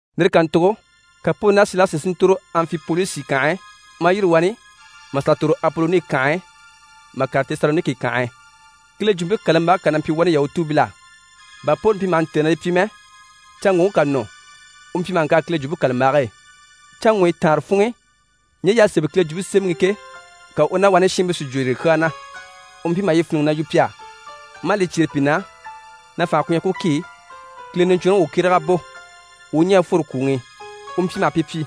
Lire kàntugo ka Poli ná Silasi si ntòro Anfipolisi kànhe e, maa yîri wani maa sà ntòro Apoloni kànhe e mà kàre Tesaloniki kànhe e. Kile Jwumpe kàlambage kà na mpyi wani Yahutuubil'á. Bà Poli mpyi maha ntêe na li pyi mɛ, canŋɔŋke ká nɔ, u mpyi maha ŋkàre Kile Jwumpe kàlambage e. Canŋɔɲyi taanre funŋ'i, ɲje y'à sémɛ Kile Jwumpe Semɛŋi i ke, ka u ná wani shiinbii si jwo yire kyaa na. U mpyi maha yi fíniŋi na yu pi á, maa li cyêre pi na na fànha ku mpyi ku ki Kile Niɲcwɔnrɔŋi u kyéreg'a bò, u u ɲɛ̀ a fworo kwùŋi i. U mpyi maha pi pyi: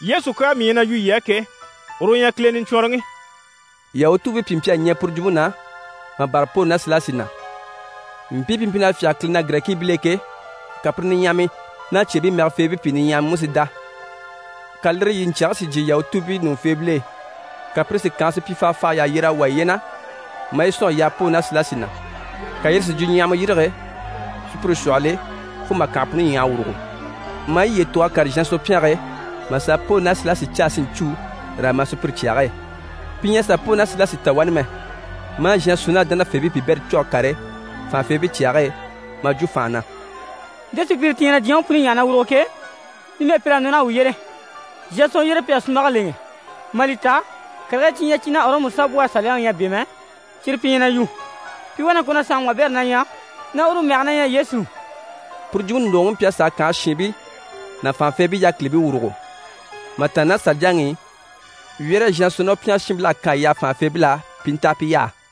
«Yesu kyaa mii ɲyɛ na yu yii á ke, uru u ɲyɛ Kile Niɲcwɔnrɔŋi.» Yahutuubii pìi mpyi a ɲɛɛ puru jwumpe na, maa bâra Poli ná Silasi na. Mpii pi mpyi na fyáge Kile na Girɛkiibil'e ke, ka pire niɲyahamii ná cyeebii mɛgɛfeebii pìi niɲyahamii mú si dá. Ka lire yiɲcyɛge si jyè Yahutuubii ɲùŋufeebil'e, ka pire si kànhe supyifahafahayi yà yyer'a wà yiye na, maa yi sɔ̀n mà wà Poli ná Silasi na. Ka yire si jwuɲyahama yîrige sùpyire shwɔhɔl'e fo mà kànhe puni ɲyàha a wùrugo. Maa piye tug'a kàre Zhasɔn pyɛnge e, mà sà a Poli ná Silasi caa si ɲcû raa ma sùpyire cyage e. Pi ɲyɛ a sà Poli ná Silasi ta wani mɛ, maa Zhasɔn ná dánafeebii piibɛrii cû a kàre fànhafeebii cyage e maa jwo fànha na: «Nte sùpyire ti ɲyɛ na diɲyɛŋi puni ɲyàha na wùruge ke, numɛ pir'à nɔ naha wuu yyére! Zhasɔn yyére pi à sunmbage lèŋɛ, mà li ta karigii cyi ɲyɛ cyi ná Ɔrɔmu saanbwɔhe saliyaŋi ɲyɛ a bɛ̂ mɛ, cyire pi ɲyɛ na yu. Pi wá na ŋko na saanŋi wabɛrɛ na ɲyɛ, na uru mɛge na ɲyɛ Yesu.» Puru jwumpe ndògoŋi mpyi a sàa kànhe shiinbii ná fànhafeebii yákilibii wùrugo. Mà tàanna ná saliyaŋi i, wyɛ́rɛ Zhasɔn ná u pyɛngɛ shiinbil'à kan a yaha fànhafeebil'á pi i nta a pi yaha.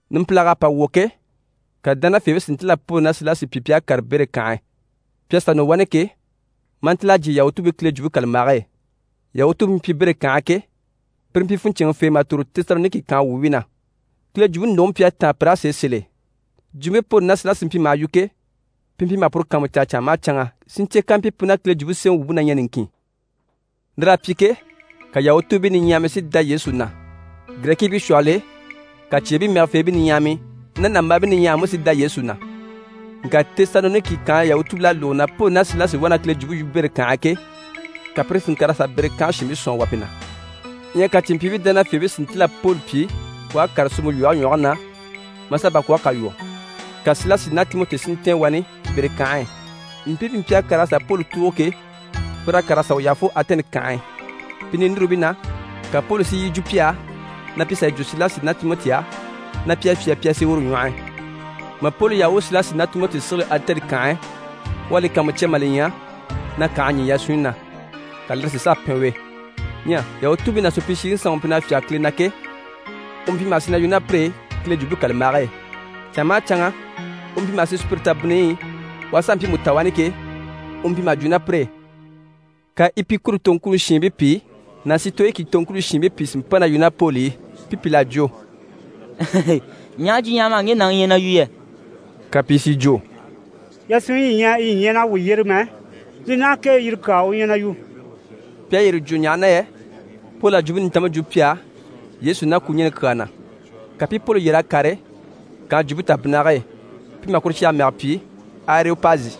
Numpilag'à pa wwɔ̀ ke, ka dánafeebii si ntíl'a Poli ná Silasi pyi pi à kàre Bere kànhe e. Pi à sà nɔ wani ke, maa ntíl'a jyè YahutuubiiKile Jwumpe kàlambage e. Yahutuubii pi mpyi Bere kànhe e ke, pire mpyi funɲcɛnŋɛfee mà tòro Tesaloniki kànhe wuubii na. Kile jwumpe ndògoŋi mpyi a táan pir'á sèe sèl'e. Jwumpe Poli ná Silasi mpyi maha yu ke, pi mpyi maha puru kàanmucaa canŋa maha canŋa, si ɲcè kampyi pu ná Kile Jwumpe Semɛŋi wumpe na ɲyɛ niŋkin. Lir'à pyi ke, ka Yahutuubii niɲyahamii si dá Yesu na. Girɛkiibii shwɔhɔl'e, ka cyeebii mɛgɛfeebii niɲyahamii ná nàmbaabii niɲyahamii mú si dá Yesu na. Ŋka Tesaloniki kànhe Yahutuubii pìl'à lógo na Poli ná Silasi wá na Kile jwumpe yu Bere kànhe e ke, ka pire si ŋkàr'a sà Bere kànhe shiinbii sɔ̀n a wà pi na. Ɲyɛ ka cìnmpyiibii dánafeebii si ntíl'a Poli pyi u à kàre suumpe lwɔhe ɲwɔge na, maa sà bakwɔɔge kà lwɔ́, ka Silasi ná Timɔti si ntɛ̀ɛn wani Bere kànhe e. Mpii pi mpyi a kàr'a sà Poli tùugo ke, pir'à kàr'a sà u yaha fo Atɛni kànhe e. Pi ninurubii na, ka Poli si yi jwo pi á na pi sà yi jwo Silasi ná Timɔti á, na pi a fyâa, pi a sì uru ɲwɔh'i. Mà Poli yaha u u Silasi ná Timɔti sigili Atɛni kànhe e, u à li kàanmucya mà li ɲya na kành'à ɲî yasunɲyi na, ka lire si sàa pɛn u e. Ɲyɛ Yahutuubii ná supyishiŋi sanŋi u mpyi na fyáge Kile na ke, u mpyi maha sì na yu ná pire e Kile Jwumpe kàlambage e. Canŋa maha canŋa, u mpyi maha sì sùpyire tabinniyi i, u aha sà mpiimu ta wani ke, u mpyi maha jwo ná pire e. Ka Epikuri toŋkuni shiinbii pìi ná Sitoyiki toŋkuni shiinbii pìi si mpa na yu ná Poli i. Pi pìl'à jwo: «Ɲaha jwuɲyahama ŋge nàŋi ɲyɛ na yu yɛ?» Ka pìi si jwo: «Yasunɲyi yi ɲyɛ yi ɲyɛ naha wuu yyére mɛ, li naha kee yire kyaa u ɲyɛ na yu.» Pi à yire jwo ɲaha na yɛ Poli à Jwumpe Nintanmpe jwo pi á Yesu ná kwuɲɛni kyaa na. Ka pi i Poli yyer'a kàre kànhe jwumpe tabinnige e, pi maha kuru cyage mɛgɛ pyi: «Areyopazi».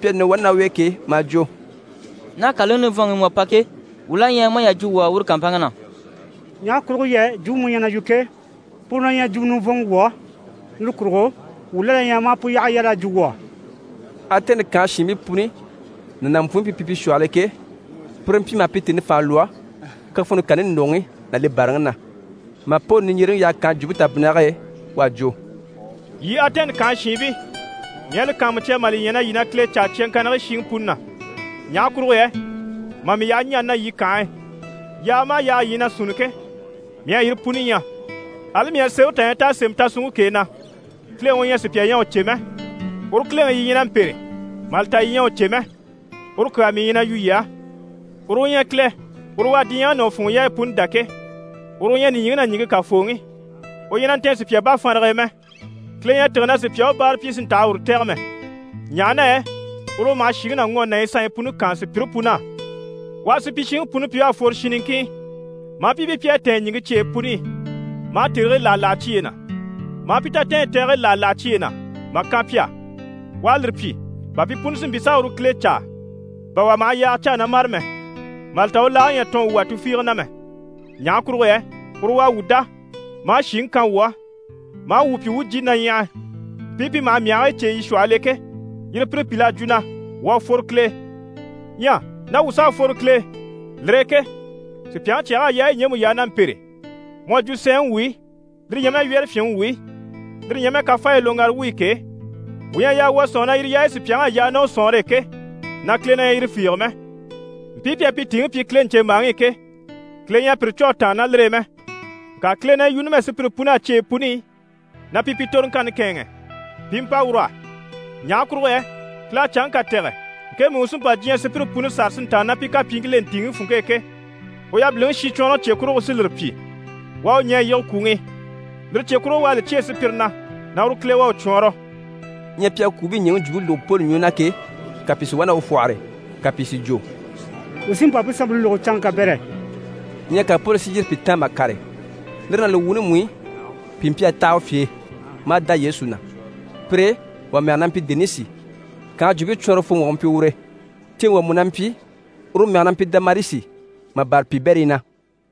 Pi à nɔ wani ná u e ke, maa jwo: «Ná kàlaŋi nivɔnŋi i mu à pa ke, wuu la ɲyɛ ma a yà jwo wuu á uru kàmpanŋke na. Ɲaha kurugo yɛ jwumpe mu ɲyɛ na yu ke, puru na ɲyɛ jwumɔ nivɔnmɔ wuu á, lire kurugo, wuu la na ɲyɛ ma a pu yyaha yal'a jwo wuu á.» Atɛni kànhe shiinbii puni ná nàmpwuunbii pi mpyi pi shwɔhɔl'e ke, pire mpyi maha pi tèni fànha lwɔ́ kafɔnni kani ndògoŋi ná li bàraŋi na. Mà Poli niɲjyereŋi yaha kànhe jwumpe tabinnige e, u à jwo: «Yii Atɛni kànhe shiinbii, mii à li kàanmucya mà li ɲya na yii na Kile caa cyaŋkannigii shiŋi puni na. Ɲaha kurugo yɛ mà mii yaha ɲani na yii kànhe e, yaaga maha yaaga yii ɲyɛ na sunni ke, mii à yire puni ɲya. Ali mii à sémɛre tà ɲya t'à sémɛ tasunŋke k'e, na “Kileŋi u ɲyɛ sùpya ɲyɛ a u cè mɛ.” Uru Kileŋi yii ɲyɛ na mpêre mà li ta yii ɲyɛ a u cè mɛ, uru kyaa mii ɲyɛ na yu yii á. Uru u ɲyɛ Kile. Uru u à diɲyɛŋi ná u funŋɔ yaayi puni dá ke, uru u ɲyɛ nìɲyiŋi ná ɲìŋke Kafooŋi. U ɲyɛ na ntɛ̀n sùpya bafanrage e mɛ. Kile ɲyɛ a tîge na sùpya u báara pyi si ntaha uru tɛ̀gɛ mɛ, ɲaha na yɛ uru u maha shìŋi ná ŋɔni ná yi sanɲyi puni kaan sùpyire pun'á. U à supyishiŋi puni pyi u à fworo shin niŋkin i, maa pi pyi pi à tɛ̀ɛn ɲìŋke cyeyi puni i, maa tèrigii láha láha cyiye na, maa pi tatɛɛnyi tɛgigii láha láha cyiye na mà kan pi á. U à lire pyi bà pi puni si mpyi s'a uru Kile caa, bà wà maha yaaga caa na mâre mɛ, mà li ta u laage ɲyɛ a tɔɔn wuu wà tufiige na mɛ. Ɲaha kurugo yɛ uru u à wuu dá, maa shìŋi kan wuu á, maa wuu pyi wuu u jìni na ɲyàha. Mpii pi maha myahigii cêe yii shwɔhɔl'e ke, yire pire pìl'à jwo na “Wuu à fworo Kile e.” Ɲyɛ ná wuu s'à fworo Kile e, lire e ke sùpyaŋi cyɛg'à yaayi ɲjemu yaa na mpêre mu à jwo sɛɛnŋi wuyi, lire ɲyɛ mɛ wyɛ́rɛfyinŋi wuyi, lire ɲyɛ mɛ kafaayi loŋgara wuyi ke, wuu ɲyɛ a yaa wuu a sɔ̂nŋi na yire yaayi sùpyaŋ'à yaa ná u sɔ̀nŋɔre e ke, na Kile na ɲyɛ yire fiige mɛ. Mpii pi à pi tìiŋi pyi Kile ɲcèmbaaŋi i ke, Kile ɲyɛ a pire cû a tàanna ná lire e mɛ. Ŋka Kile na yi yu numɛ sùpyire pun'á cyeyi puni i, na pi pi toroŋkanni kɛ̂ɛnŋɛ pi i mpa ur'á. Ɲaha kurugo yɛ Kile à canŋke kà tɛ̀gɛ, ŋkemu i u sí n‑pa diɲyɛŋi sùpyire puni sâra si ntàanna ná pi kapyiiŋkil'e ntìiŋi funŋke e ke. U yabiliŋi shincwɔnrɔŋi cye kurugo u sí lire pyi. U à u ɲɛ̀ a yige kwùŋi i, lire cye kurugo u à li cyêe sùpyire na na uru Kile à u cwɔɔnrɔ.» Ɲyɛ pi à kwùubii ɲɛ̀ŋi jwumpe lógo Poli ɲwɔ na ke, ka pìi si wá na u fwɔ́hɔre, ka pìi si jwo: «Wuu sí n‑pa pu sanmpe lógo canŋke kabɛrɛ.» Ɲyɛ ka Poli si yîri pi taan mà kàre. Lire ná li wuuni mú i, pìi mpyi a taha u fye e, maa dá Yesu na. Pire e, wà mɛge na mpyi Denisi. Kànhe jwumpe cwɔɔnrɔfooŋi wà u mpyi ure. Ceeŋi wà mú na mpyi, uru mɛge na mpyi Damarisi, mà bâra piibɛrii na.